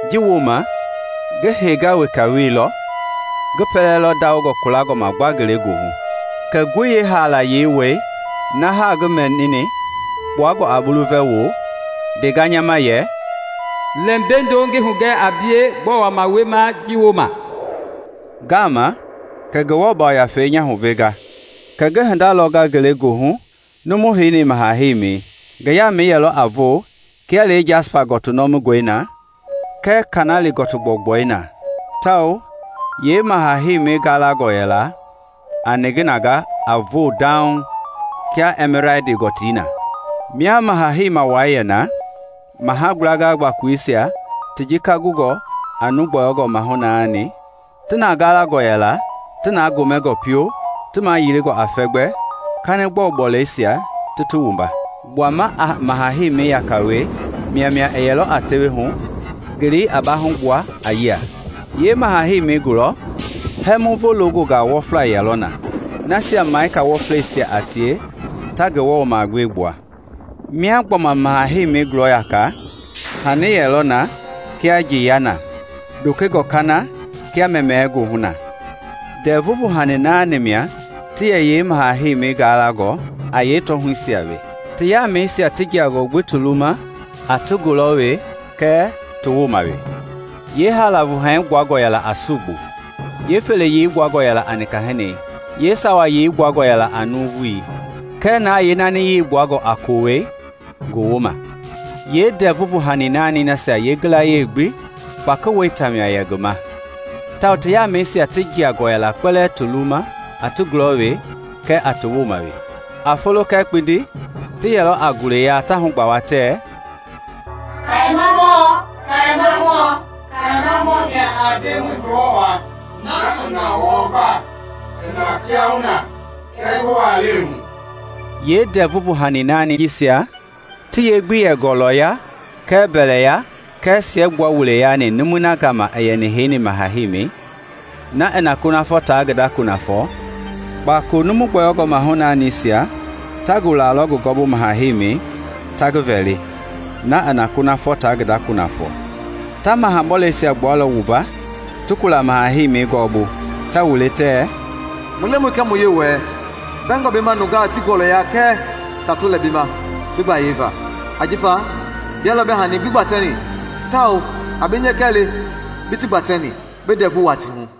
Ji wooma ngi henga weka wielɔ, ngi dui lɔ kulangɔ ma gba ngelegoohu. Kɛ ngoi yeehaalayei wɛi na haa ngi mɛnini kpuangɔ a bulu vɛ wo ndenga nya ma yɛ, “Lɛ mbeindo ngi hugɛ a bie gbɔɔ wama wiema ji wooma.” Ngaama kɛ Ngewɔ Yafei nya huvenga, kɛ ngi hinda lɔnga ngelegoohu numui heni yeemaha heimei. Ngi yambu yɛlɔ a voo kia lee jasipa gɔtii nɔmingɔi na kɛɛ kanɛlia gɔtii gbɔugbɔi na, tawao yee maha heimei galangɔ yɛla a niginangei a voo dauŋ kia ɛmiladi gɔtii na. Mia maha-heima wai yɛ na maha gblanga gbakoleisia ti jika gungɔ a nuu gbɔyɔngɔ mahu naani ti na galangɔ yɛla ti na gomɛngɔ fio ti mayilingɔ a fɛmgbei, kanigbɔlu bɔleisia ti ti wumba. Gbuama a maha heimi yaka we maimai yɛlɔ a tewehu, ngelei a baahugbua a yia. Yee maha heimei gulɔ, hɛmuvo loongɔnga wɔfla ti yɛlɔ na, nasia ngafa wɔfleisia a tie ta Ngewɔ magbee gbua. Mia gbɔma maha heimi gulɔ yaka, hani yɛlɔ na kia njeiyɛi na, dokengɔ kana kia mɛmɛɛ goohu na. Ndɛvu vuhani naani mia ti yɛ yeemaha heimi galangɔ a yee tɔɔhuisia we, ti yaamɛisia ti jiangɔ gbi ti luwuma a ti gulɔ we kɛɛ ti woma we. Yee haala vuhani gbuangɔ yɛla a sugbui; yee feleyei gbuangɔ a nika hini; yeesawayei gbuangɔ a nuuvui; kɛɛ na yeenaaniyei gbuangɔ a kowɛi gowoma. Yeendɛvu vuhani naani nasia yeeyilayee gbi kpaki weita mia yɛ ngi ma tawao ti yaamɛisia ti jiangɔ yɛla kpɛlɛɛ ti luwuma a ti gulɔ kɛɛ ti woma we. A folo kɛɛ kpindi, ti yɛlɔ a gule yaa ta hugbawa tɛ: “Kayemamɔ, kayemamɔ, kayemamɔ mia a Ndemɔi Ngewɔ waa, na i na wɔɔ gbaa, i na kiahuna, kɛɛ ngi walɛi hu.” Yeendɛvu vuhani naani jisia ti ye gbi yɛ gɔlɔya kɛɛ mbɛlɛya kɛɛ siɛgbua wuleisia yaani numui gama i heini maha heimi, na i na kunafɔ ta ngi da kunafɔ, kpakolo nuu gbɔyɔngɔ mahu-naanisia ta gulalɔ ngi gɔɔbu maha heimi ta ngi vɛli, na i na kunafɔ ta ngi da kunafɔ. Ta maha bɔleisia gbualɔ wumba ti kula maha heimi gɔɔbu, ta wule tɛ, “Mu Lemɔi kɛɛ mu Yewɔɛi, bɛngɔ bi ma nungaa ti gɔlɔya kɛɛ tato lɛ bi ma bi gbayei va. Ajifa bia lɔ bi hani gbi gbatɛni, tawao a bi nyɛkɛ le bi ti gbatɛni bi ndɛvu wuaa ti hu!”